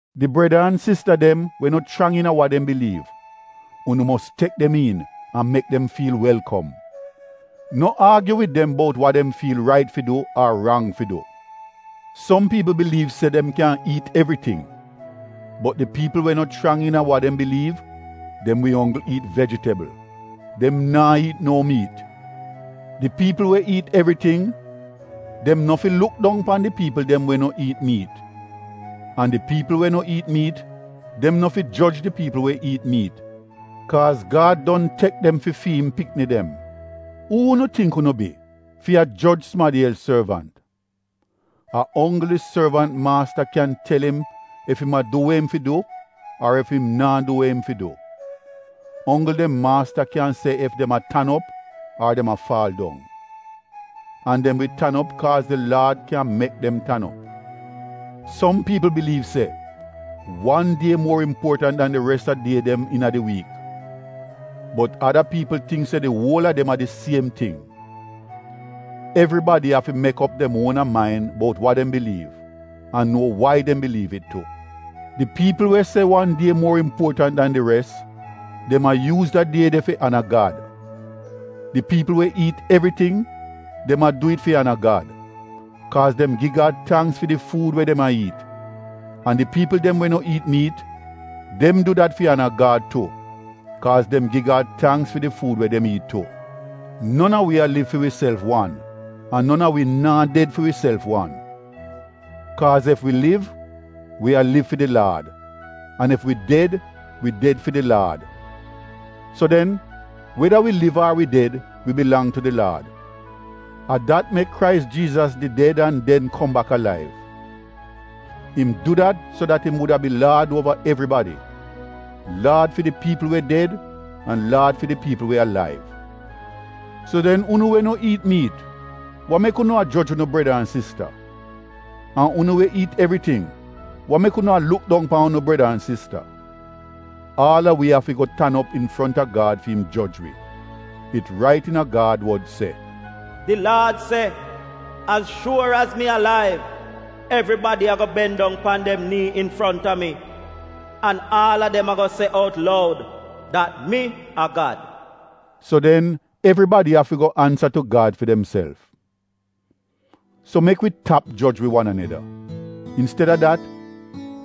Di breda an sista dem we no chrang iina wa dem biliiv, unu mos tek dem iin an mek dem fiil welkom. No aagyu wid dem bout wa dem fiil rait fi du ar rang fi du. Som piipl biliiv se dem kyan iit evriting, bot di piipl we no chrang iina wa dem biliiv, dem wi onggl iit vejitebl — dem naa iit no miit. Di piipl we iit evriting dem no fi luk dong pan di piipl dem we no iit miit an di piipl we no iit miit, dem no fi joj di piipl we iit miit kaaz Gad don tek dem fi fi im pikni dem. Uu unu tingk unu bi, fi a joj sumadi els sorvant? A onggl di sorvant maasta kyan tel im ef im a du we im fi du ar ef im naa du we im fi du — onggl dem maasta kyan se ef dem a tan op ar dem a faal dong. An dem wi tan op kaaz di Laad kyan mek dem tan op. Som piipl biliiv se wan die muor impuotant dan di res a die dem iina di wiik, bot ada piipl tingk se di uol a dem a di siem ting. Evribadi afi mek op dem uona main bout wa dem biliiv an nuo wai dem biliiv it tu. Di piipl we se wan die muor impuotant dan di res, dem a yuuz da die de fi ana Gad. Di piipl we iit evriting, dem a du it fi ana Gad, kaaz dem gi Gad tangks fi di fuud we dem a iit. An di piipl dem we no iit miit, dem du dat fi ana Gad tu, kaaz dem gi Gad tangks fi di fuud we dem iit tu. Non a wi a liv fi wiself wan an non a wi naa ded fi wiself wan. Kaaz ef wi liv, wi a liv fi di Laad; an ef wi ded, wi ded fi di Laad. So den, weda wi liv ar wi ded, wi bilang tu di Laad. A dat mek Krais Jiizas did ded an den kom bak alaiv; im du dat so dat im wuda bi Laad uova evribadi — Laad fi di piipl we ded an Laad fi di piipl we alaiv. So den unu we no iit miit — wa mek unu a joj unu breda an sista? An unu we iit evriting — wa mek unu a luk dong pan unu breda an sista? Aal a wi afi go tan op infronta Gad fi im joj wi. It rait iina Gad wod se: “Di Laad se, ‘Az shuor az mi alaiv, evribadi ago ben dong pan dem nii infronta mi an aal a dem ago se out loud dat mi a Gad.’” So den evribadi afi go ansa tu Gad fi demself. So mek wi tap joj wi wan aneda. Insteda dat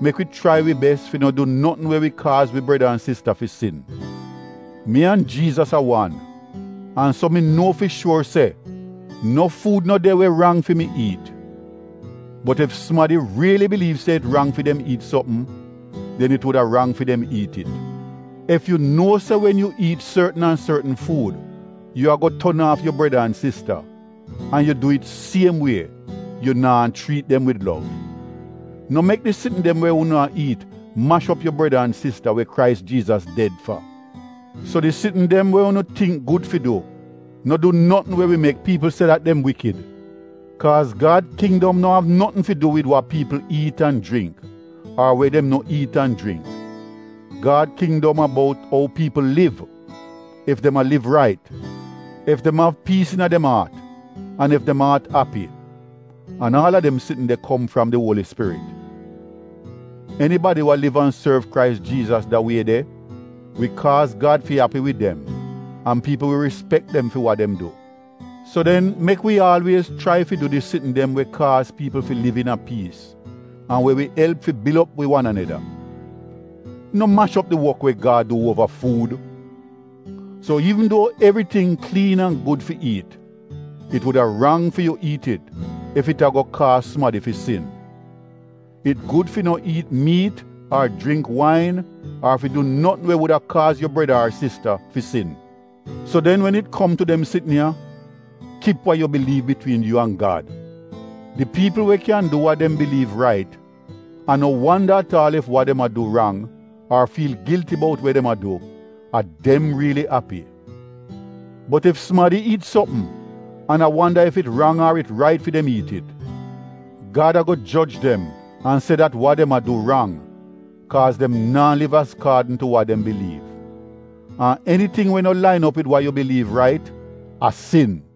mek wi chrai wi bes fi no du notn we wi kaaz wi breda an sista fi sin. Mi an Jiizas a wan an so mi nuo fi shuor se no fuud no de we rang fi mi iit. Bot ef sumadi riili biliiv se it rang fi dem iit sopm, den it wuda rang fi dem iit it. Ef yu nuo se wen yu iit sortn an sortn fuud yu ago ton aaf yu breda an sista, an yu du it siem wie, yu naa chriit dem wid lov. No mek di sitn dem we unu a iit mash op unu breda an sista we Krais Jiizas ded fa. So di sitn dem we unu tingk gud fi du, no du notn we wi mek piipl se dat dem iivl. Kaaz Gad Kindom no av notn fi du wid wa piipl iit an jringk ar we dem no iit an jringk. Gad kindom a bout ou piipl liv; ef dem a liv rait, ef dem av piis iina dem aat, an ef dem aat api — an aal a dem sitn de kom fram di Uoli Spirit. Enibadi we liv an sorv Krais Jiizas da wie de, wi kaaz Gad fi api wid dem an piipl wi rispek dem fi wa dem du. So den mek wi aalwiez chrai fi du di sitn dem we kaaz piipl fi liv iina a piis an we wi elp fi bil op wi wan aneda. No mash op di wok we Gad du uova fuud. So iivn duo evriting kliin an gud fi iit, it wuda rang fi yu iit it ef it ago kaaz sumadi fi sin. It gud fi no iit miit ar jringk wain ar fi du notn we wuda kaaz yu breda ar sista fi sin. So den wen it kom tu dem sitn ya, kip wa yu biliiv bitwiin yu an Gad. Di piipl we kyan du wa dem biliiv rait an no wanda at aal ef wa dem a du rang ar fiil gilti bout we dem a du, a dem riili api. Bot ef sumadi iit sopm, an a wanda ef it rang ar it rait fi dem iit it, Gad ago joj dem an se dat wa dem a du rang, kaaz dem naa liv azkaadn tu wa dem biliiv. An eniting we no lain op wid wa yu biliiv rait, a sin.